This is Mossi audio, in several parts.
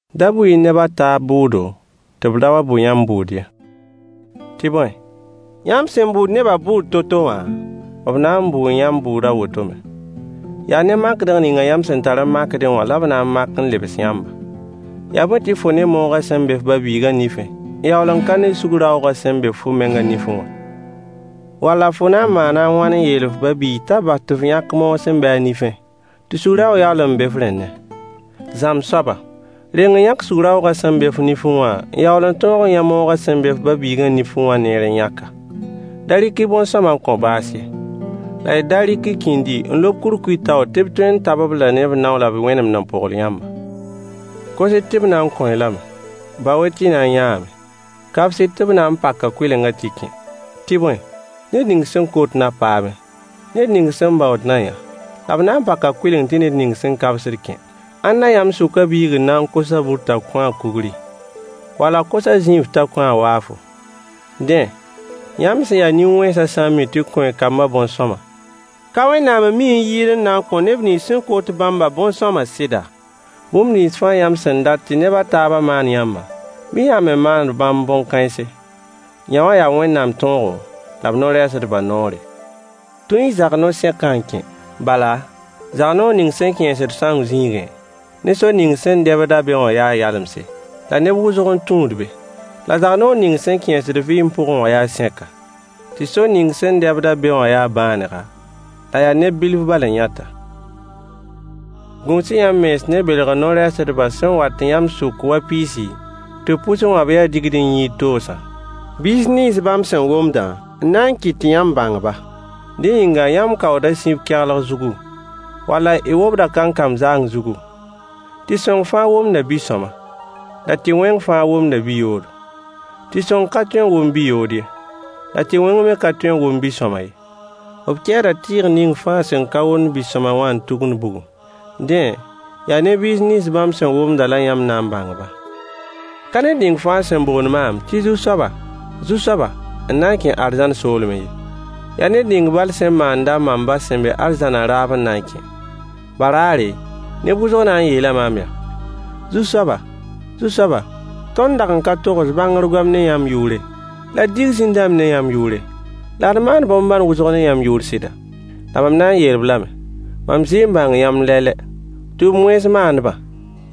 Da bʋ-y neb a taab bʋʋdo, tɩ b da wa bʋ yãmb bʋʋd ye. Tɩ bõe, yãmb sẽn bʋʋd nebã bʋʋd to-to wã, b na n bʋʋ yãmb bʋʋd a woto me. Yaa ne makdg ning yãmb sẽn tar n makdẽ wã la b na n mak n lebs yãmba. Yaa bõe tɩ fo ne moogã sẽn be f ba-biigã nifẽ n yaool n ka ne sug-raoogã sẽn be fo mengã nifẽ wã? Walla fo na n maana a wãn n yeel f ba-biig t'a bas tɩ f yãk moog sẽn be a nifẽ, tɩ sug-raoog yaool n be f rẽndẽ? Zãmb soaba! Reng n yãk sug-raoogã sẽn be fo nifẽ wã n yaool n tõog n yã moogã sẽn be f ba-biigã nifẽ wã neer n yãk-a. Da rɩk-y bõn-sõama n kõ baas ye, la y da rɩk y kĩndi n lob kurkuy taoor tɩ b tõe n tab-b-la ne b nao la b wẽnemd n pogl yãmba. Kos-y tɩ b na n kõo-y lame. Bao-y tɩ y na n yãame. Kabs-y tɩ b na n paka kʋɩlengã tɩ y kẽ. Tɩ bõe, ned ning sẽn kot na paame, ned ning sẽn baood na yã, la b na pak kʋɩleng tɩ ned ning sẽn kabsd kẽ. Ãnna yãmb sʋkã biig n na n kos-a bur t'a kõ-a kugri? Wall a kos-a zĩinf t'a kõ-a waafo? Dẽ, yãmb sẽn ya nin-wẽnsã sã n mi tɩ kõ y kambã bõn-sõama, ka Wẽnnaam n mi n yɩɩd n na n kõ neb nins sẽn kot bãmbã bõn-sõama sɩda? Bũmb nins fãa yãmb sẽn dat tɩ neb a taabã maan yãmba, bɩ yãmb me maan bãmb bõn-kãense. Yõwã yaa Wẽnnaam tõogo la b no-rɛɛsdbã noore. Tũ-y zag-no-sẽkã n kẽ. Bala zag-noor ning sẽn kẽesd sãoong zĩigẽ, ne sor ning sẽn dɛbd-a be wã yaa yalemse, la neb wʋsg n tũud be. La zag-noor ning sẽn kẽesd vɩɩm pʋgẽ wã yaa sẽka, tɩ sor ning sẽn dɛbd-a be wã yaa bãanega, la yaa neb bilf bal n yãt-a. Gũus-y yãmb mens ne belgr no-rɛɛsdbã sẽn wat yãmb sʋk wa piis tɩ b pʋsẽ wã b ya digd-n-yĩid-toosã. Biis nins bãmb sẽn womdã n na n kɩt tɩ yãmb bãng-ba. Dẽ yĩnga yãmb kaooda sib kɛglg zugu, walla y wobd kankam zaang zugu? Tɩ-sõng fãa womda bi-sõama, la tɩ-wẽng fãa womda bi-yoodo. Tɩ-sõng ka tõe n wom bi-yood ye, la tɩ-wẽng me ka tõe n wom bi-sõama ye. B kɛɛda tɩɩg ning fãa sẽn ka womd bi-sõama wã n tugund bugum. Dẽ, yaa ne biis nins bãmb sẽn womdã la yãmb na n bãng-ba. Ka ned ning fãa sẽn boond maam tɩ Zu-soaba! Zu-soaba! N na n kẽ arzãn soolmẽ ye. Yaa ned ning bal sẽn maand-a mam ba sẽn be arzãnã raab n na n kẽ. Baraare, neb wʋsg na n yeela maam yaa: Zu-soaba! Zu-soaba! Tõnd dag n ka togs bãngr goam ne yãmb yʋʋre, la d dig zĩn-dãmb ne yãmb yʋʋre, la d maan bõn-bãn wʋsg ne yãmb yʋʋr sɩda? La mam na n yeel-b lame: “Mam zɩ n bãng yãmb lɛ-lɛ. Tʋʋm-wẽns maandbã,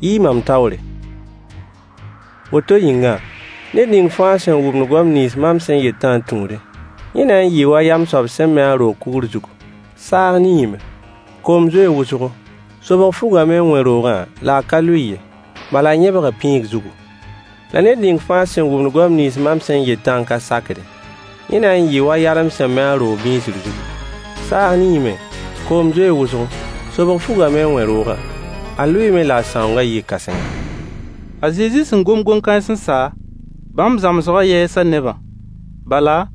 yi-y mam taoore.” Woto yĩnga, ned ning fãa sẽn wʋmd goam nins mam sẽn yetã n tũudẽ, yẽ na n yɩɩ wa yam soab sẽn me a roog kugr zugu. Saag niime, koom zoee wʋsgo, sobg fugame n wẽ roogã la -a ka lʋɩ ye, bala a yẽbga pĩig zugu. La ned ning fãa sẽn wʋmd goam nins mam sẽn yetã n ka sakdẽ, yẽ na n yɩɩ wa yalem sẽn me a roog bĩisir zugu. Saag niime, koom zoee wʋsgo, sobg fugame n wẽ roogã. A lʋɩɩme la a sãoongã yɩɩ kãsenga. A Zezi sẽn gom koe-kãens n sa, bãmb zãmsgã yɛɛsa nebã. Bala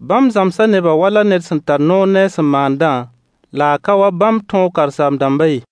bãmb zãmsa nebã wala ned sẽn tar noor ne a sẽn maandã, la a ka wa bãmb tõog karen-saam-dãmbã ye.